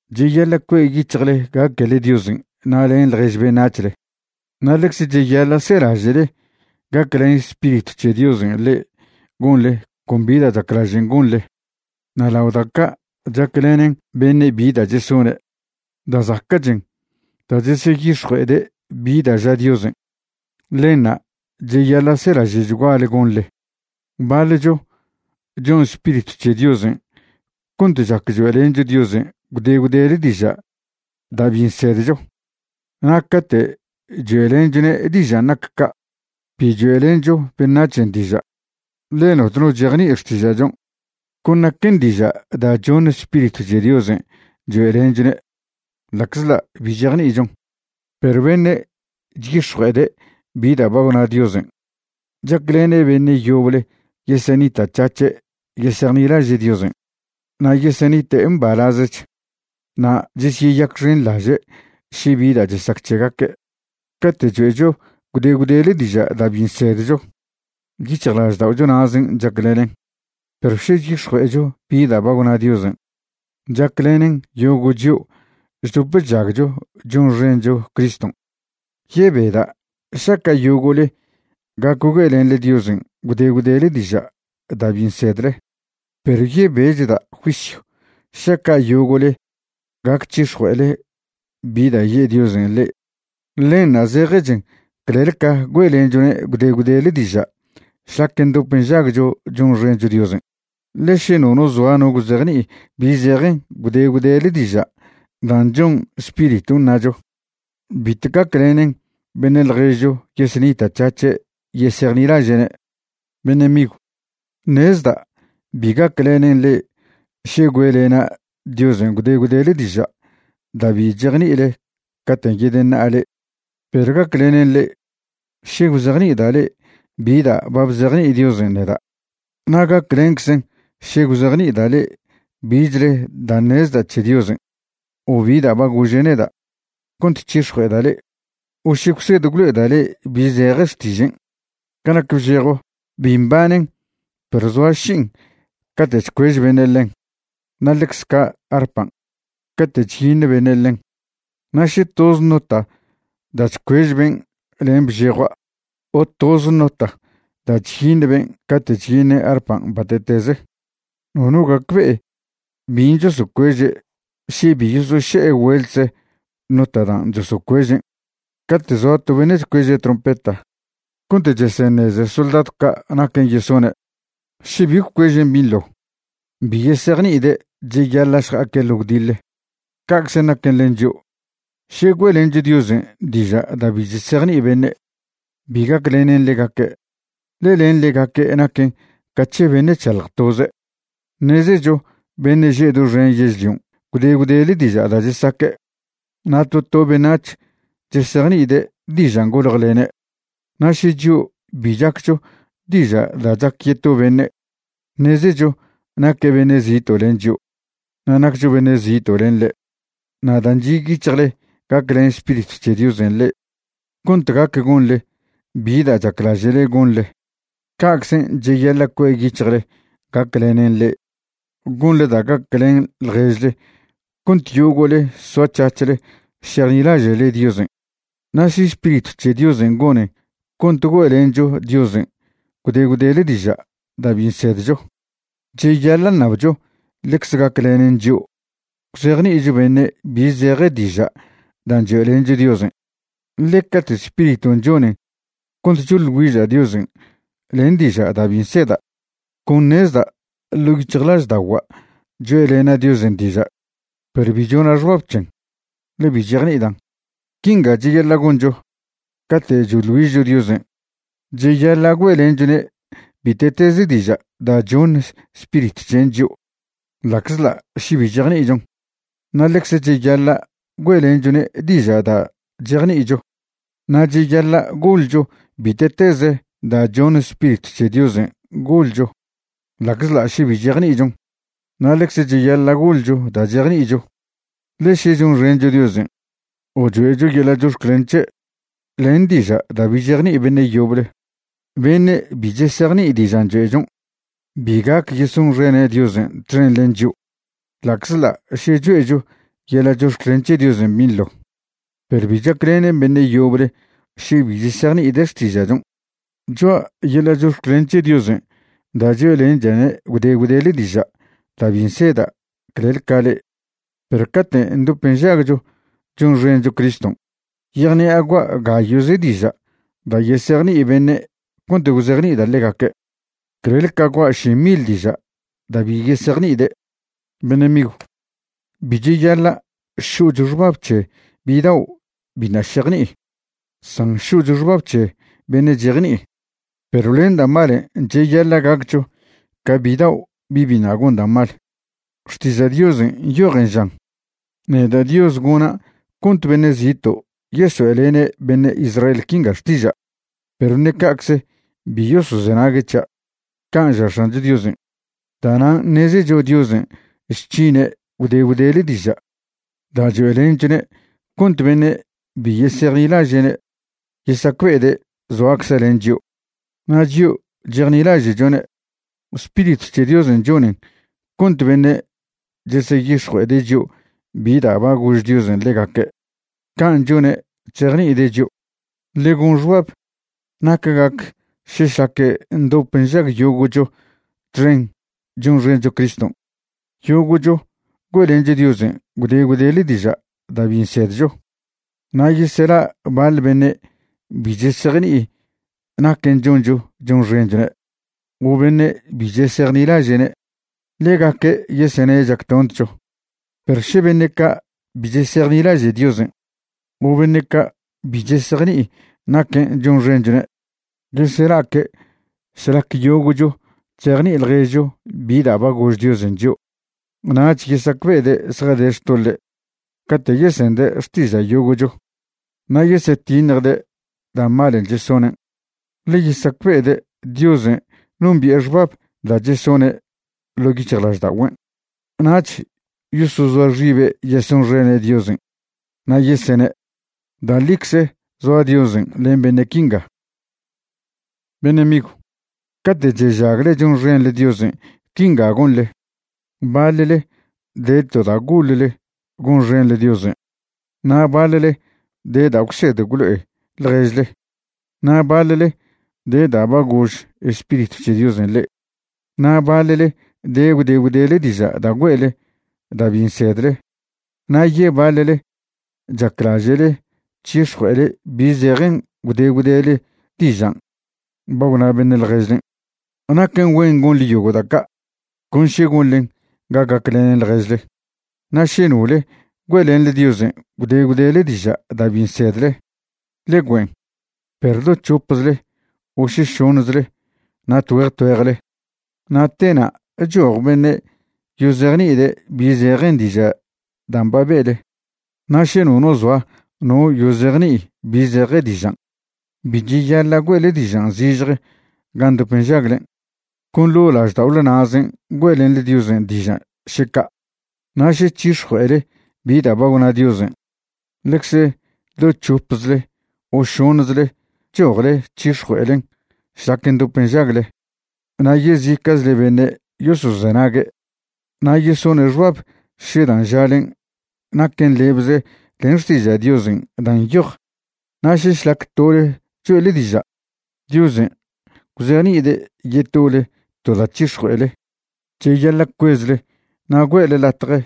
Cheyaḻa' cue' yic̱hjle gaquele Diosen' na' len ḻjež beṉac̱hle, na' ḻecze cheyaḻa' selaže'le gaclen Spiritw c̱he Diosen' le'e gonle con bi da' chaclažen' gonle. Na' lao da' ca' chaclenen beṉe' bi da' chesone', da' zaca'chen da' cheseyix̱jue'ede' bi da' ža Diosen'. Ḻenṉa' cheyaḻa' selaže'chguale gonḻe. Baḻcho chon Spiritw c̱he Diosen' cont chac choe'lencho Diosen' gwde gwdele diža' da' bi nsedcho. Na' cate' choe'lenchone' dižan' nac ca', bi choe'lencho beṉac̱hen' diža', ḻe notno chejni'i xtiža'chon', con naquen diža' da' choṉ Spiritw c̱he Diosen' choe'lenchone' ḻa'czḻa' bi chejni'ichon. Perw beṉe' chyix̱jue'ede' bi da' ba gwna Diosen', chaclene' beṉe' yoble yesenita'c̱hac̱he' yesejnilaže' Diosen', na' yesenite' mbalazech, na' chesyeyacxenḻaže' še bi da' chesac c̱hegaque'. Cate' choe'cho gwde gwdele diža' da' bi nsedcho, yic̱hjlažda'ocho na'zen' chaclenen. Perw še chyix̱jue'echo bi da' ba gwna Diosen', chaclenen yogo' chio' chdop chžagcho chonxencho Criston'. Yebeda' šaca' yogo'le gac güe'lenḻe Diosen' gwde gwdele diža' da' bi nsedle, perw yebechda' juisyw šaca' yogo'le gac c̱hix̱jue'ele bi da' ye' Diosen' le'e. Ḻenṉa' zejechen clel ca güe'lenchone' gwde gwdele diža' šlac ndop nžagcho chonxencho Diosen'. Ḻe še nono zoa no gwzejni'i bi zejen gwde gwdele diža' dan' chon Spiriton' ṉacho, bitw gaclenen beṉe' ḻjezcho yesenita'c̱hac̱he' yesejnilaže'ne'. Beṉe' migw, ṉezda' bi gaclenen le'e še güe'lena' Diosen' gwde gwdele diža' da' bi chejni'ile caten' yedeṉa'a le'e. Perw gaclenen le'e še gwzejni'ida' le'e bi da' ba bzejni'i Diosen' neda'. Na' gaclenczen še gwzejni'ida' le'e bichle da' ṉezda' c̱he Diosen', o bi da' ba gože' neda' cont c̱hix̱jue'eda' le'e, o še gwsed gwlo'eda' le'e bi zeje xtižen'. Ca nac bžejo, bi mbanen perw zoa ši'in cate' chcuež beṉe' ḻen, na' ḻecze ca' arpan' cate' chyiṉ beṉe' ḻen. Na' še toz nota da' chcuež ben' len bžejoa' o toz nota da' chyiṉ ben' cate' chyiṉe' arpan' bate'teze, nono gacbe'e bin' chosocueže' še bi yosoše'e güeltze nota dan' chosocuežen'. Cate' zoa to beṉe' chcueže' trompeta cont cheseṉeze soldadw ca' naquen' yesone', še bi gwcuežen' binḻo, bi yesejni'ide' cheyaḻa' šja'aque' ḻo gwdiḻe. Ca'cze naquen len chio', še güe'lencho Diosen' diža' da' bi chesejni'i beṉe', bi gaclenen ḻegaque', ḻe len ḻegaque' naquen ca c̱he beṉe' chšalj toze'. Ṉezecho beṉe' že' doxen yežlion' gwde gwdele diža' da' chesaque', na' to to beṉac̱h chesejni'ide' dižan' goljelene'. Na' še chio' bi chaccho diža' da' chac yeto beṉe', ṉezecho naque' beṉe' zito' len chio' na' naccho beṉe' zito' len ḻe'. Na' dan' chi' yic̱hjle gaclen Spiritw c̱he Diosen' le'e cont gac gonḻe bi da' chaclaže'le gonḻe, ca'czen cheyaḻa' cue' yic̱hjle gaclenen le'e gonḻe da' gaclen ḻježle cont yogo'le soac̱hac̱hle šejnilaže'le Diosen'. Na' še Spiritw c̱he Diosen' gonen cont güe'lencho Diosen' gwde gwdele diža' da' bi nsedcho, cheyaḻa' ṉabcho ḻecze gaclenen chio' gwzejni'icho beṉe' bi zeje diža' dan' choe'lencho Diosen'. Ḻe cate' Spiriton' chonen cont choḻ güiža' Diosen' len diža' da' bi nseda', con ṉezda' ḻo' yic̱hjlažda'ogua' choe'lena' Diosen' diža', perw bi chona' xbab c̱hen, ḻe bi chejni'idan'. Quinga cheyaḻa' goncho cate' choḻ güižcho Diosen', cheyaḻa' güe'lenchone' bite'teze diža' da' choṉ Spiritw c̱hen' chio' ḻa'czḻa' še bi chejni'ichon, na' ḻecze cheyaḻa' güe'lenchone' diža' da' chejni'icho. Na' cheyaḻa' goḻcho bite'teze da' choṉ Spiritw c̱he Diosen' goḻcho ḻa'czḻa' še bi chejni'ichon, na' ḻecze cheyaḻa' goḻcho da' chejni'icho. Ḻe še chonxencho Diosen' o choe'cho yeḻa' chox̱clen c̱he' len diža' da' bi chejni'i beṉe' yoble, beṉe' bi chesejni'i dižan' choe'chon' bi gac yesonxene' Diosen' txen len chio'. Ḻa'czḻa' še choe'cho yeḻa' chox̱clen c̱he Diosen' binḻo, perw bi chaclenen beṉe' yoble še bi chesejni'ide' xtiža'chon'. Choa' yeḻa' chox̱clen c̱he Diosen' da' choe'lencha'ne' gwde gwdele diža' da' bi nseda' clel ca le'e. Perw cate' ndop nžagcho chonxencho Criston' yejṉi'a gua' gayo'ze diža' da' yesejni'i beṉe' cont gwzejni'ida' ḻegaque', clel ca gua' ši mil diža' da' bi yesejni'ide'. Beṉe' migw, bi cheyaḻa' šo'cho xbab c̱he bidao' biṉa' šejni'i, san šo'cho xbab c̱he beṉe' chejni'i. Perw len da' malen' cheyaḻa' gaccho ca bidao' bi' biṉa' gon da' mal. Xtiža' Diosen' nyojen žan: “Neda' Dios gona' cont beṉe' zito' yesoe'lene' beṉe' Israel quinga xtiža', perw ṉe ca'cze bi yosozenague' c̱hia'.” Can' ža X̱ancho Diosen'. Da'nan' ṉezecho Diosen' chc̱hine' gwde gwdele diža' da' choe'lenchone' cont beṉe' bi yesejnilaže'ne' yesacbe'ede' zoacze' len chio'. Na' chio' chejnilaže'chone', Spiritw c̱he Diosen' chonen cont beṉe' cheseyix̱jue'ede' chio' bi da' ba gož Diosen' ḻegaque'. Can' chone' chzejni'ide' chio'. Ḻe gon xbab nac gac še šlac ndop nžag yogo'cho txen chonxencho Criston' yogo'cho güe'lencho Diosen' gwde gwdele diža' da' bi nsedcho, na' yesela' baḻ beṉe' bi chesejni'i naquen' choncho chonxenchone' o beṉe' bi chesejnilaže'ne', ḻegaque' yesene' chactontcho. Perw še beṉe' ca' bi chesejnilaže' Diosen' o beṉe' ca' bi chesejni'i naquen' chonxenchone' yesela'aque' šlac yogo'cho chzejni'i ḻježcho bi da' ba gož Diosen' chio', nach yesacbe'ede' zjade xtoḻe' cate' yesende' xtiža' yogo'cho, na' yesyetiṉjde' da' malen' chesonen'. Ḻe yesacbe'ede' Diosen' nombi'e xbab da' chesone' ḻo' yic̱hjlažda'ogüen', nach yosozoa xibe' yesonxene' Diosen' na' yesene': “Da' ḻicze zoa Diosen' len beṉe' quinga.” Beṉe' migw, cate' chežagle chonxenḻe Diosen' quinga gonḻe: Baḻle de to da' goḻle gonxenḻe Diosen', na' baḻle de da' gwsed gwlo'e ḻježle, na' baḻle de da' ba gož Spiritw c̱he Diosen' le'e, na' baḻle de gwde gwdele diža' da' güe'le da' bi nsedle, na' yebaḻle chaclaže'le c̱hix̱jue'ele bi zejen gwde gwdele dižan' ba gwna beṉe' ḻježlen'. Naquen güen gonḻe yogo' da' ca' con še gonḻen ga gaclenen ḻježle. Na' še nole güe'lenḻe Diosen' gwde gwdele diža' da' bi nsedle, ḻe güen', perw do c̱hopzle o še šoṉzle na' tgüeje tgüejle, na' tena' choj beṉe' yozejni'ide' bi zejen diža' dan' ba be'le. Na' še nono zoa no yozejni'i bi zeje dižan', bi cheyaḻa' güe'le dižan' zižje gan' ndop nžaglen', con ḻo' lažda'ole na'zen' güe'lenḻe Diosen' diža', še ca'. Na' še c̱hix̱jue'ele bi da' ba gwna Diosen', ḻecze do c̱hopzle o šoṉzle chojle c̱hix̱jue'elen šlac ndop nžagle na' yezica'chle beṉe' yosozenague' na' yesone' xbab še dan' žalen' naquen lebze len Xtiža' Diosen' dan' nyoj. Na' še šlac tole choe'le diža', Diosen' gwzejni'ide' yetole to da' c̱hix̱jue'ele, cheyaḻa' cuezle na' güe'le latje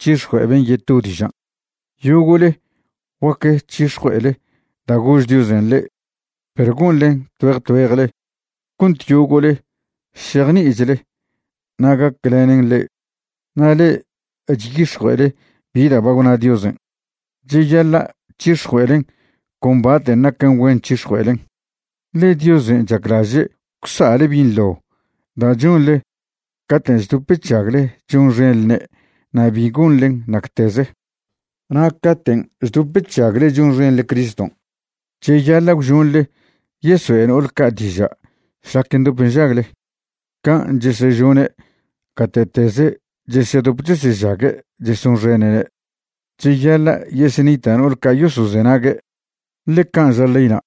c̱hix̱jue'e ben' yeto dižan'. Yogo'le guac c̱hix̱jue'ele da' gož Diosen' le'e, perw gonḻen tgüeje tgüejle cont yogo'le šejni'ichle na' gaclenen le'e. Na' le'e chyix̱jue'ele bi da' ba gwna Diosen', cheyaḻa' c̱hix̱jue'elen con baten' naquen güen c̱hix̱jue'elen. Ḻe Diosen' chaclaže' gwsa'le binḻo da' chonḻe caten' chdop chžagle chonxenḻne' na' bi gonḻen nacteze. Na' caten' chdop chžagle chonxenḻe Criston', cheyaḻa' gwžonḻe yesoe' no'ol ca' diža' šlac ndop nžagle, can' chesežone' gate'teze chesedop chesežague' chesonxene'ne'. Cheyaḻa' yesenita' no'ol ca' yosozenague', ḻe can' ža leyna'.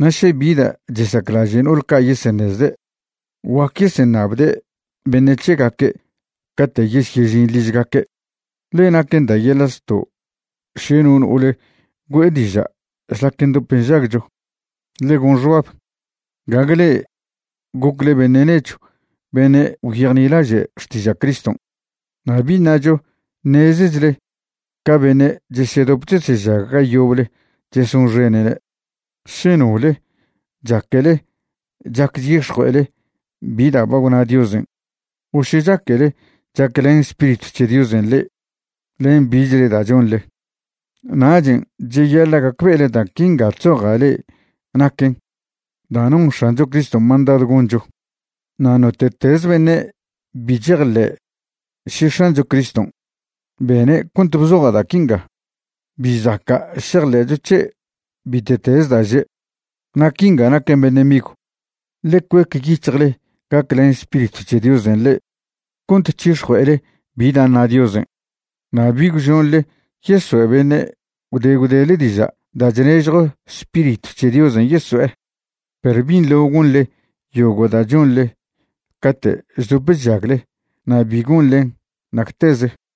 Na' še bi da' chesaclaže' no'ol ca' yeseṉezde', guac yeseṉabde' beṉe' c̱hegaque' cate' yesyežin ližgaque', ḻe naquen da' yeḻa' zto' še no no'ole güe'e diža' šlac ndop nžagcho. Ḻe gon xbab, gague le'e gocle beṉe' nechw beṉe' gwyejnilaže' xtiža' Criston', na' bi ṉacho ṉezechle ca beṉe' chesedop chesežag ga yoble chesonxene'ne'. Še nole chaquele chac chyix̱jue'ele bi da' ba gwna Diosen' o še chaquele chaclen Spiritw c̱he Diosen' le'e len bichle da' chonḻe, nachen' cheyaḻa' gacbe'ele da' quinga chzoja' le'e naquen da' non X̱ancho Criston' mandadw goncho. Na' note'teze beṉe' bi chejḻe'e še X̱ancho Criston' bene' cont bzoja' da' quinga, bi zaca' šejḻe'cho c̱he' bite'teze da' že'. Na' quinga naquen beṉe' migw, ḻe cuec yic̱hjle gaclen Spiritw c̱he Diosen' le'e cont c̱hix̱jue'ele bi da' ṉa Diosen', na' bi gwžonḻe yesoe' beṉe' gwde gwdele diža' da' chnežjw Spiritw c̱he Diosen' yeso'e. Perw binḻo gonḻe yogo' da' chonḻe cate' chdop chžagle na' bi gonḻen nacteze.